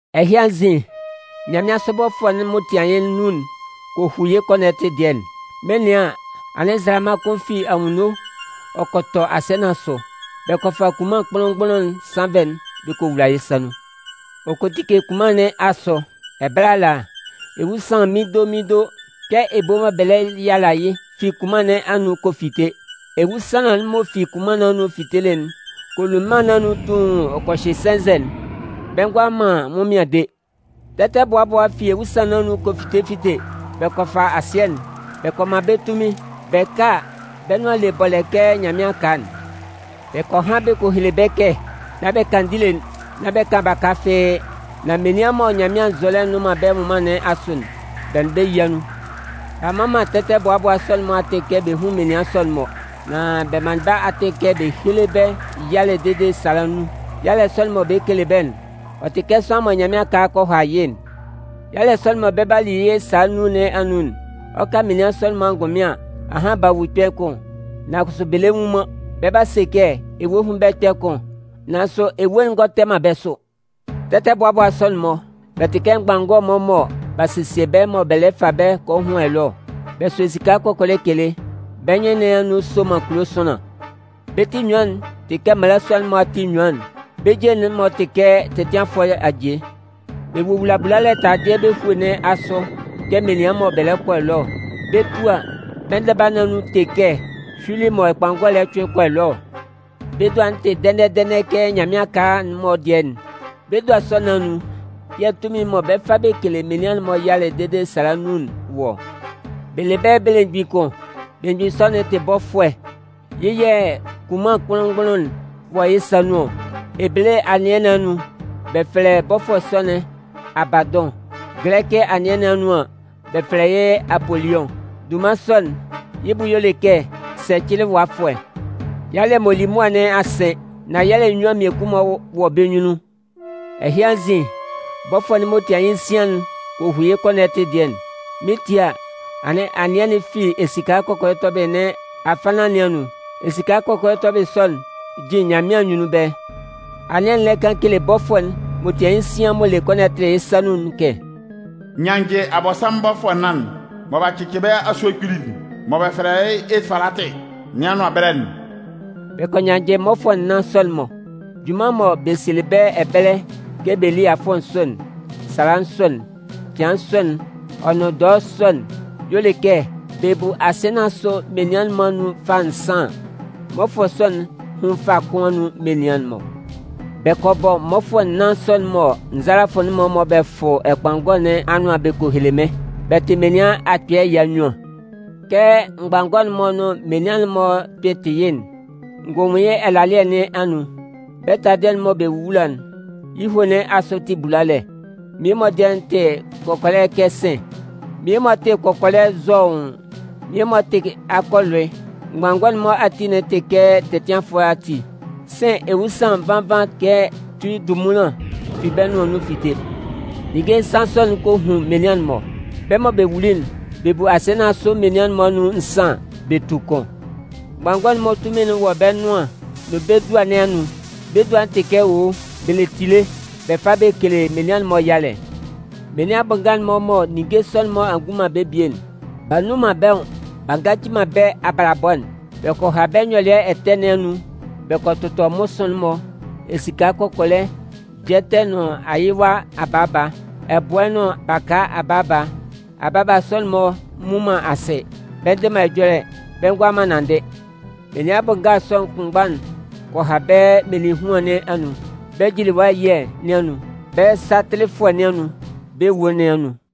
Ɛhɩ anzin, nyanmɩansʋ bɔfʋɛ'n m'ɔ tian yɩ́ nnun'n kɔ hu yɩ́ kɔnɔtɩ dɩɛ'n. Mɩn 'nɩan an, anɩn nzalama kʋn fi anwunno ɔ kɔ tɔ asɩɛ nɩn asʋ. Bɛ kɔ fa kunman kpʋnlʋn-mgbʋnlʋn sannvɛ'n bɛ kɔ wula yɩ́ sa nun. Ɔ kɔ tike kunman nɩn asʋ. Ɛbɛlɛ ala, ewusanlan mindo, mindo, kɛ ebo mɔ bɛ lɛ yala yɩ́ fi kunman nɩn anun kɔ fite. Ewusanlan'n m'ɔ fi kunman nɩn anun fitelɩ'n kɔ lu mân nɩn anun tuun ɔ kɔ hyɩ sɛnzɛ'n, bɛ ngʋala man ɛnwʋnmɩan de. Tɛtɛbʋabʋa fi ewusanlan nɩn anun kɔ fite fite, bɛ kɔ fa asɩɛ'n. Bɛ kɔ man bɛ́ tunmin. Bɛ ka a, bɛ́ nʋan'n le bɔlɛ kɛ nyanmɩan aka'n. Bɛ kɔ han bɛ kɔ hele bɛ́ kɛ nán bɛ kan ndile'n, nán bɛ kan baka fɩ́ɩ́. Nan menian mɔ Nyanmɩan nzɔlɛ nnʋn man bɛ́ nwʋnman nɩn asʋ'n, bɛ nʋn bɛ́ yía nun. B'a mman man tɛtɛbʋabʋa sɔ'n-mɔ atɩn kɛ bɛ hún menian sɔ'n-mɔ. Nan bɛ manlɩn bɛ́ atɩn kɛ bɛ héle bɛ́ yalɛ dede sala nnun. Yalɛ sɔ'n mɔ bɛ 'kele bɛ́'n, ɔ tɩ kɛ sʋanlan mɔ nyanmɩan aka kɔ ha yɩ́'n. Yalɛ sɔ'n mɔ bɛ 'ba li yɩ́ sala nnun nɩn anun'n, ɔ 'ka menian sɔ'n-mɔ angʋnmɩn an, ahan b'a wu kpɛ̂ kʋn, nan kʋsʋ bɛ le nwu man. Bɛ 'ba se kɛ ewue hún bɛ́ kpɛ̂ kʋn, nan kʋsʋ ewue'n ngɔ tɛ man bɛ́ sʋ. Tɛtɛbʋabʋa sɔ'n-mɔ, bɛ tɩ kɛ mgbanngɔ-mɔ mɔ b'a sesie bɛ́ mɔ bɛ lɛ fa bɛ kɔ hʋn ɛlɔɛ ɔ. Bɛ sʋ esika kɔkɔlɛ kele. Bɛ́ nyɩn nɩn anun soman kulo sʋanlan. Bɛ́ ti enyuan'n tɩ kɛ mmalasua'n-mɔ ati enyuan'n. Bɛ́ je'n-mɔ tɩ kɛ tɛtɩanfʋɛ aje. Bɛ wowula bulalɛ taladɩɛ bɛ́ hue nɩn asʋ kɛ menian mɔ bɛ lɛ kɔ ɛlɔɛ ɔ. Bɛ 'tu a, bɛ́ ndɛba nɩn anun te kɛ hyuili mɔ ɛkpanngɔ lɛ cʋɩn kɔ ɛlɔɛ ɔ. Bɛ́ dua'n tɩ dɛnɛ-dɛnɛ kɛ nyanmɩan aka'n-mɔ dɩɛ'n. Bɛ́ dua sɔ nɩn anun yɛ̂ tunmin'n mɔ bɛ 'fa bɛ kele menian'n-mɔ yalɛ dede sala nnun'n wɔ ɔ. Bɛ le bɛ́ belemgbin kʋn. Belemgbin sɔ'n tɩ bɔfʋɛ. Yɩ́ yɛ̂ kunman kpʋnlʋn-mgbʋnlʋn'n wɔ yɩ́ sa nun ɔ. Ebele anɩɛ nɩn anun, bɛ fɛlɛ bɔfʋɛ sɔ'n “Abadʋn”. Gɛlɛkɩ anɩɛ nɩn anun an, bɛ fɛlɛ yɩ́ “Apoliʋn”. Dunman sɔ'n, yɩ́ bʋ y'ɔ le kɛ sɛcɩlɩwafʋɛ. Yalɛ m'ɔ li mʋa nɩn a sɩn. Nan yalɛ nnyuan mmiekun-mɔ wɔ bɛ́ nyunnun. Ɛhɩ anzin, bɔfʋɛ'n m'ɔ tian yɩ́ nsian'n kɔ hu yɩ́ kɔnɔtɩ dɩɛ'n. Mɩn 'tie a, anɩn anɩɛ'n fi esika kɔkɔlɛ tɔbɩlɩ nɩn afannan nɩn anun. Esika kɔkɔlɛ tɔbɩlɩ sɔ'n jin Nyanmɩan anyunnun ɛbɛlɛ. Anɩɛ'n lɛ kan kele bɔfʋɛ'n m'ɔ tian yɩ́ nsian m'ɔ le kɔnɔtɩ'n yɩ́ sa nun'n kɛ: “Nyannjɩ Abɔnsanmʋn mmɔfʋɛ nnan'n mɔ b'a cɩcɩ bɛ́ asue kpili'n mɔ bɛ fɛlɛ yɩ́ Efalatɩ nɩn anʋan ɛbɛlɛ'n.” Bɛ kɔ nyannjɩ mmɔfʋɛ nnan sɔ'n-mɔ. Junman mɔ bɛ sielɩ bɛ́ ɛbɛlɛ kɛ bɛ lí afʋɛ sɔ'n, sala sɔ'n, cɩan sɔ'n ɔ nʋn dɔɛ sɔ'n, y'ɔ le kɛ, bɛ bu asɩɛ nɩn asʋ menian'n-mɔ anun fâ nsan an, mmɔfʋɛ sɔ'n hún fâ kʋn anun menian'n-mɔ. Bɛ kɔ bɔ mmɔfʋɛ nnan sɔ'n-mɔ nzalafʋ'n-mɔ mɔ bɛ fʋ ɛkpanngɔ nɩn anʋan bɛ kɔ hele mɩ́n. Bɛ tɩ menian akpɩɩ ɛya nnyuan. Kɛ mgbanngɔ'n-mɔ nʋn menian'n-mɔ kpɩn tɩ yɩ́'n, n gɔ nwun yɩ́ ɛlalɩɛ nɩn anun. Bɛ́ taladɩɛ'n mɔ bɛ wowula'n, yɩ́ hue nɩn asʋ tɩ bulalɛ. Mmie-mɔ dɩɛ'n tɩ kɔkɔlɛ kɛ sɩ̂n, mmie-mɔ tɩ kɔkɔlɛ zɔʋn, mmie-mɔ tɩ akɔ ɛlʋɩ. Mgbanngɔ'n-mɔ ati'n tɩ kɛ tɛtɩanfʋɛ ati. Sɩ̂n ewusanlan nvan nvan kɛ tui ndunmunlan fi bɛ́ nʋan anun fite. Ninnge nsan sɔ'n kɔ hun menian'n-mɔ. Bɛ́ mɔ bɛ wuli'n, bɛ bu asɩɛ nɩn asʋ menian'n-mɔ anun nsan an, bɛ tu kʋn. Mgbanngɔ'n-mɔ tunmin'n wɔ bɛ́ nʋan'n nʋn bɛ́ dua nɩn anun. Bɛ́ dua'n tɩ kɛ owo, bɛ le tile, bɛ fa bɛ kele menian'n-mɔ yalɛ. Menian bʋ nga'n-mɔ mɔ ninnge sɔ'n-mɔ a ngun man bɛ́ bie'n, b'a nnun man bɛ́ nwʋn b'a ngaci man bɛ́ abalabɔ'n. Bɛ kɔ ha bɛ́ nyɔlɩɛ ɛtɛ nɩn anun, bɛ kɔ tʋtɔ mmʋsʋɩn'n-mɔ, esika kɔkɔlɛ, jɛtɛ nʋn ayɩwa abaaba, ɛbʋɛ nʋn baka abaaba. Abaaba sɔ'n-mɔ nnwun man asɩ, bɛ ndɩ man ɛjɔlɛ, bɛ ngʋala man nanndɩ. Menian bʋ nga sɔ kʋnmgba'n kɔ ha bɛ́ meninhuan nɩn anun, bɛ́ jiliwa ɛyɩɛ nɩn anun, bɛ́ satɩlɩfʋɛ nɩn anun, bɛ́ awue nɩn anun.